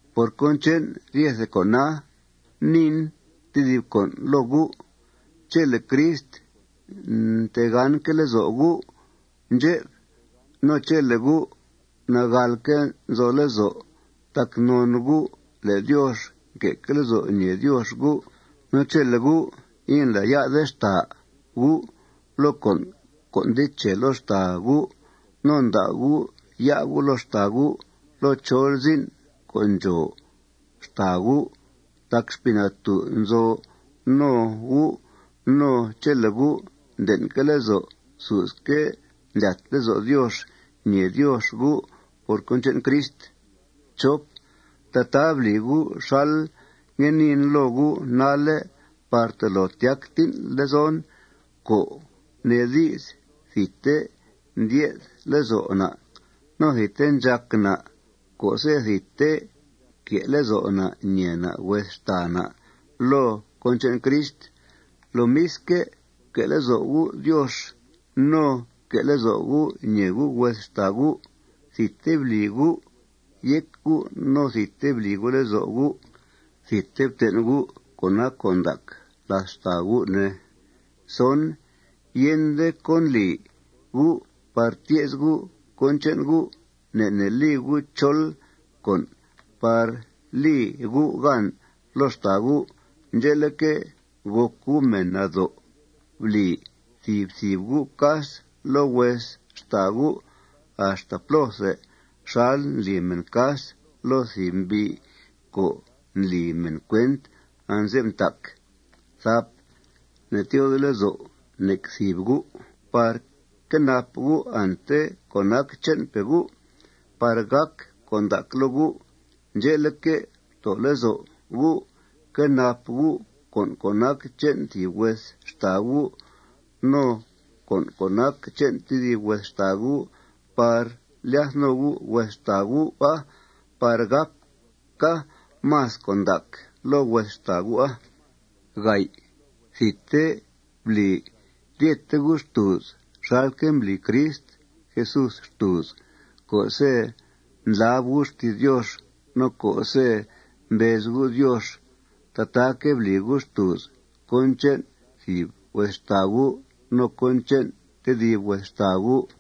Por cón che'n ryete con'a, niin tedib con' loo gu': Chele' Crist ntegánque' lezo' gu' ndxep, no chele' gu' nagàlque' nzo lezo' tac non gu' le' Diox nque' lezo' ñee Diox gu', no chele' gu' indlá'ya'de xtàa gu' loo con' co' nde che loo xtàa gu', no nda' gu' ya' gu' loo xtàa gu' loo chol zin' co' ndxòo xtàa gu' tac Xpii Natú' nzo no gu', no chele' gu' nden'que' lezo' susque' ndlyat lezo' Diox ñèe Diox gu' por cón che'n Crist, tataa bli gu' xal ngue niin loo gu' nalle' par tolo tyac tín' lezon, co' nee di's, thidte ndye'th lezo' na' no thidte ndxàc na' co'se' thidte que' lezo' na' ñèe na' hues xtàa na' loo cón che'n Crist. Lomisque', fque' lezo' gu' Diox no fque' lezo' gu' ñèe gu' hues xtàa gu'. Thidte bli gu' yéc gu' no thidte bli gu' lezo' gu'. Thidte ften' gu' cón nac con' ndac làth xtàa gu', ne. Yende cón li gu' par tye's gu' cón che'n gu'. Ne' ne' li gu' chol con' par li gu' gan loo xtàa gu'. Ndxe'leque', gòc gu' mèn nado'. Bli thìb thìb gu' cas loo hues xtàa gu' axta plóthe xal ndli mèn cas loo thìb mbi' co' ndli mèn cuent anze'f ntac. Ne'tyoode lezo' nec thìb gu' par quenap gu' ante co' nac che'npe' gu' par gàca con' ndac loo gu'. Ndxe'leque', ftoo lezo' gu' quenap gu' con' co' nac che'n thìb hues xtàa gu' no con' co' nac che'n tedib hues xtàa gu' par lyath no gu' hues xtàa gu'a par gàca más con' ndac loo hues xtàa gu'a. Thidte bli ryete gu' xtùuz xalque' mbli Crist Jesús xtùuz co'se' ndlab gu' xti's Diox no co'se' mbez gu' Diox. Tataaque' bli gu' xtùuz cón che'n thìb hues xtàa gu' no cón che'n tedib hues xtàa gu'.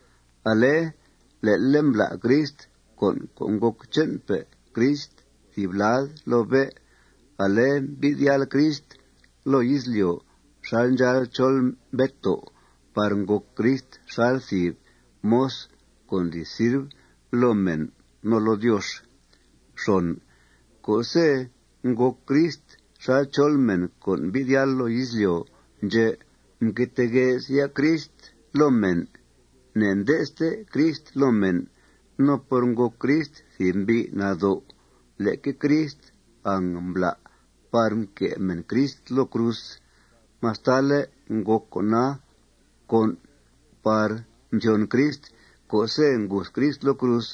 Ale le'le' mblá' Crist con' co' ngòc che'npe' Crist thìb lad loo bé'. Ale mbi'th yáal Crist loo izlyo' xal ndxáal chol mbeto' par ngòc Crist xal thìb moz co' ndli sirv loo mèn no loo Diox. Co'se' ngòc Crist xal chol mèn co' mbi'th yáal loo izlyo' ndxè', mque tee gue's ya' Crist loo mèn. Ne'nde'ste Crist loo mèn. No por ngòc Crist thìb mbi' nado', leque Crist angmbla' par mque' mèn Crist loo cruz mastale' ngòc con'a con' par thyon Crist co'se' nguth Crist loo cruz.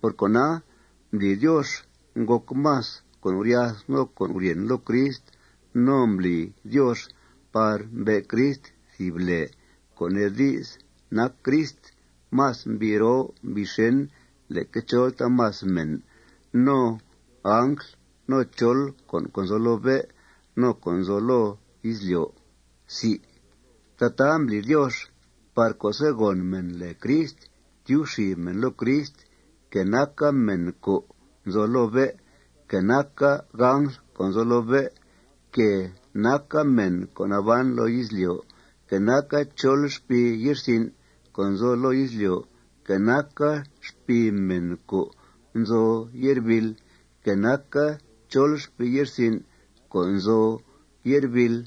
Por cona, mbli Diox ngòc más con' guryath no con' guryèn loo Crist. No mbli Diox par mbe' Crist thìb lèe, co' nee di's, nac Crist más mbi' roo mbi' xèn leque chol taamas mèn, no angl, no chol con' co' nzo loo bé', no co' nzo loo izlyo'. Tataa mbli Diox par co'se' gòn mèn lèe Crist, tyub xib mèn loo Crist, que naca mèn co' nzo loo bé', que naca angl co' nzo loo bé', que naca mèn co' naban loo izlyo', que naca chol xpii ye'rsin' co' nzo loo izlyo', que naca xpii mèn co' nzo ye'rbìil, que naca chol xpii ye'rsin' co' nzo ye'rbìil.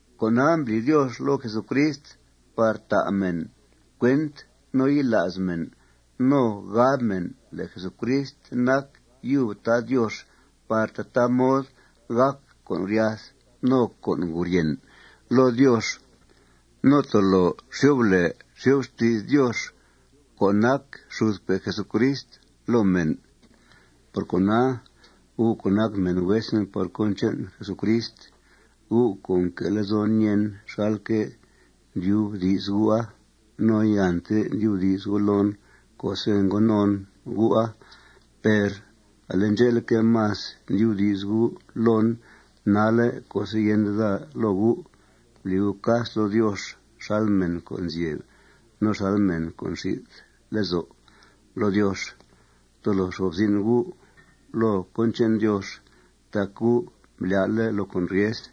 Con'a mbli Diox loo Jesucrist par ta' mèn cuent, no yila's mèn, no gab mèn le' Jesucrist nac yub Tad Diox par tataa mod gàc con' guryath no con' guryèn loo Diox no tolo xyo'f lèe xyo'f xti's Dios co' nac xudpe' Jesucrist loo mèn. Por cona, gu' co' nac mèn huesen por cón che'n Jesucrist, gu' co' nque' lezon ñèen, xalque' ndyubdi's gu'a, no iante ndyubdi's gu' loon co'se' ngo non gu'a, per ale ndxe'leque', más ndyubdi's gu' loon nalle' co'se' yende daa loo gu', bli gu' cas loo Diox xal mèn co' nzyeb no xal mèn co' nxi'th lezo' loo Diox. Tolo fxo'f zin' gu' loo cón che'n Diox tac gu' mblyá'le' loo con' ryes.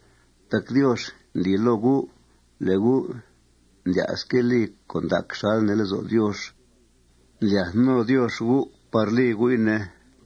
Tac Diox ndli loo gu' le' gu' ndlya'sque' li con' ndac xal nee lezo' Diox. Ndlyath no Diox gu' par li gu'i, ne.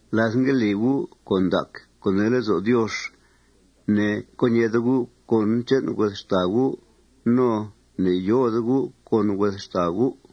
Láth ngue li gu' con' ndac co' nee lezo' Diox, ne'co ñeede gu' cón che'n hues xtàa gu' no ne'yoode gu' con hues xtàa gu'.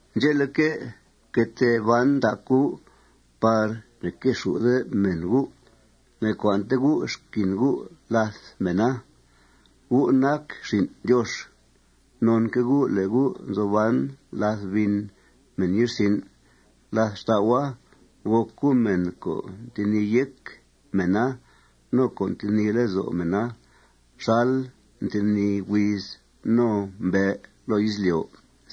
Ndxe'leque', fque tee ban ndac gu' par ne'quexù'de mèn gu'. Ne'cua'nte gu' xquin gu' làth mèna. Gu' nac xin' Diox. Nonque' gu' le' gu' nzo ban làth bin mèn ye'rsin'. Làth xtau'a, gòc gu' mèn co' ntenìi yéc mèna no co' ntenìi lezo' mèna xal ntenìi huiz no mbe' loo izlyo'.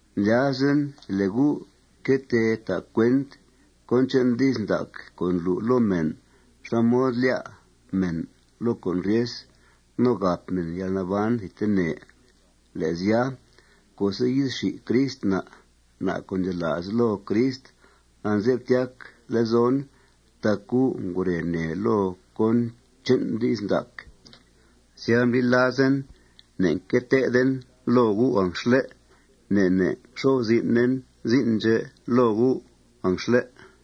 Ndlyazen le' gu' que tee ta' cuent cón che'n di's ndac co' ndlu' loo mèn xá mod lyá' mèn loo con' ryes no gàp mèn yalnaban thidtene. Le' sya, co'se' yi'th xi Crist na', na' co' ndxela's loo Crist, anze'f tyac lezon tac gu' ngure nèe loo cón che'n di's ndac. Sya, mbli lazen ne'nque teeden loo gu' anxle'. Ne' ne' nxo'f zin'en zin' ndxè' loo gu' anxle'.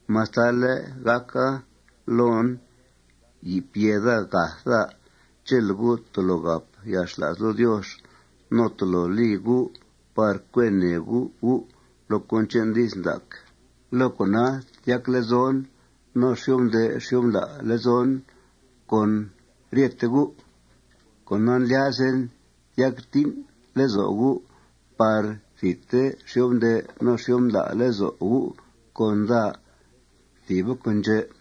Mastale' gàca loon yi'f yèe daa gath daa, chele' gu' tolo gàp yalxla's loo Diox no tolo li gu' par cue nèe gu' gu' loo cón che'n di's ndac, loo con'a tyac lezon no xyo'f nde' xyo'f ndla' lezon con ryete gu'. Cona, ndlyazen tyac tín' lezo' gu' par thidte xyo'f nde' no xyo'f ndla' lezo' gu' con daa. Thìba con' ndxè'.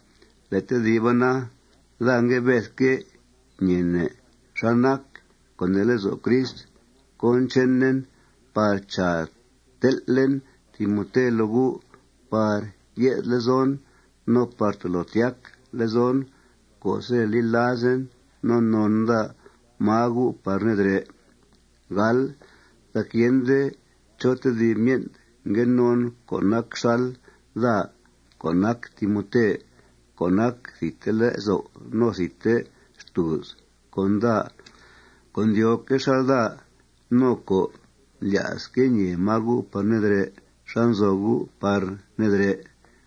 Le' tediba na, daa ngue bedque' ñeene' xá nac co' nee lezo' Crist cón chenen par, chàa, tel'en Timote loo gu' par ye'th lezon no par tolo tyac lezon co'se' li lazen no non daa máa gu' par nedrè'. Tac yende chó tedib myen' ngue non co' nac xal daa co' nac Timote co' nac thidte lezo' no thidte xtùuz con daa co' ndyóoque' xal daa no co' ndlya'sque' ñee máa gu' par nedrè', xá nzo gu' par nedrè'.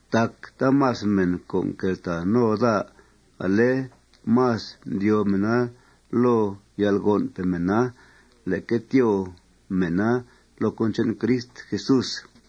Tac taamas mèn co' nqueltàa no daa, ale más ndyóo mèna loo yalgon'pe' mèna leque tyóo mèna loo cón che'n Crist Jesús.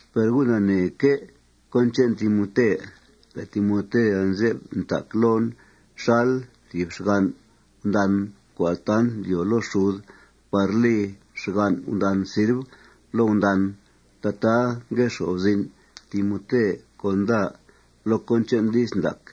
Per gu' naneeque' cón che'n Timote, le' Timote anze'f ntac loon xal thìb xgan' gundan co' altant ndyoo loo xud par li xgan' gundan sirv loo gundan. Tataa ngue xo'f zin' Timote con daa loo cón che'n di's ndac.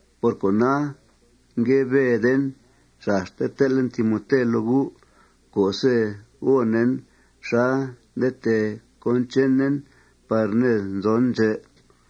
Por cona, ngue beden xaste tel'en Timote loo gu' co'se' gònen xá nde tee cón chenen par ned nzon ndxè'.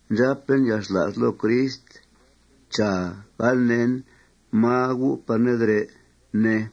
Ndxàpen yalxla's loo Crist, chàa, gal neen máa gu' par nedrè', ne.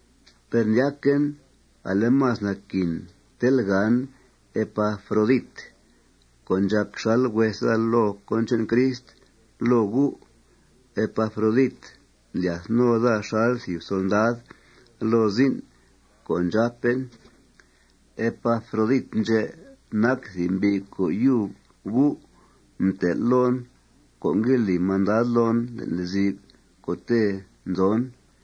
Per ndyaquen ale, más naquin tel'gàn Epafrodit, co' ndxàc xal hues daa loo cón che'n Crist loo gu'. Epafrodit ndlyath no daa xal thìb solndad loo zin' co' ndxàpen. Epafrodit ndxè' nac mbi' co' yub gu' mtel' loon co' ngue li mandad loon le'n lezi'f co'te' nzon.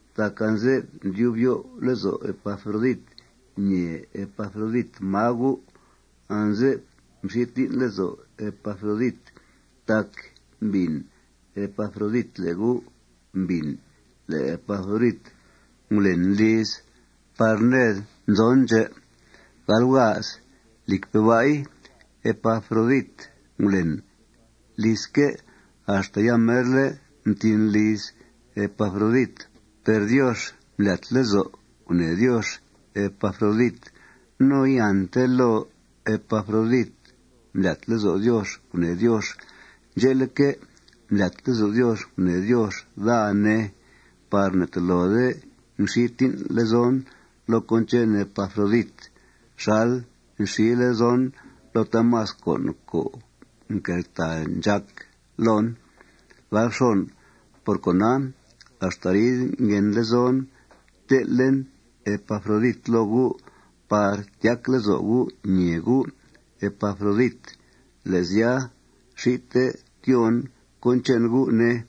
Tac anze'f ndyub yo'f lezo' Epafrodit ñee Epafrodit máa gu'. Anze'f mxi tín' lezo' Epafrodit tac mbìn Epafrodit le' gu' mbìn le' Epafrodit ngulen liz par ned nzon ndxè'. Lìcpe' ba'i, Epafrodit ngulen lizque' axta yamerle' mtín liz Epafrodit. Per Diox mblyat lezo' gunèe Diox Epafrodit. No iante loo Epafrodit mblyat lezo' Diox gunèe Diox. Ndxe'leque', mblyat lezo' Diox gunèe Diox daa, ne, par ne'tolode ngxi tín' lezon loo cón che'n Epafrodit xal nxi lezon loo taamas con' co' nqueltàa ndxàc loon. Por cona, axta arid nguen lezon tel'en Epafrodit loo gu' par tyac lezo' gu' ñèe gu' Epafrodit. Le' sya, xite tyóon cón che'n gu', ne.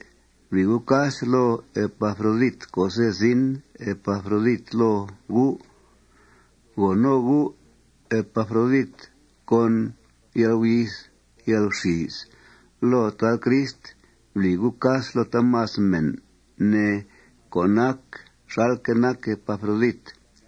Bli gu' cas loo Epafrodit co'se' zin Epafrodit loo gu'. Go no gu' Epafrodit con yalguyith yalguxìis loo Tad Crist. Bli gu' cas loo taamas mèn, ne, co' nac xalque' nac Epafrodit.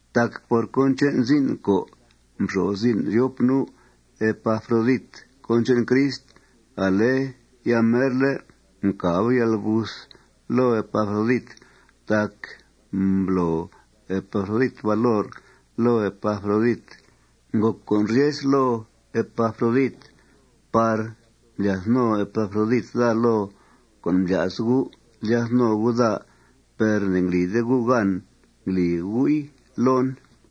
Tac por cón che'n zin' co' mxo'f zin' ryop nu' Epafrodit cón che'n Crist ale yamerle' mcàba yalguth loo Epafrodit. Tac mblo Epafrodit valor loo Epafrodit. Ngòc con' ryes loo Epafrodit par mblyath no Epafrodit daa loo co' mblya's gu' lyath no gu' daa per ne'nglide gu' gan ngli gu'i loon.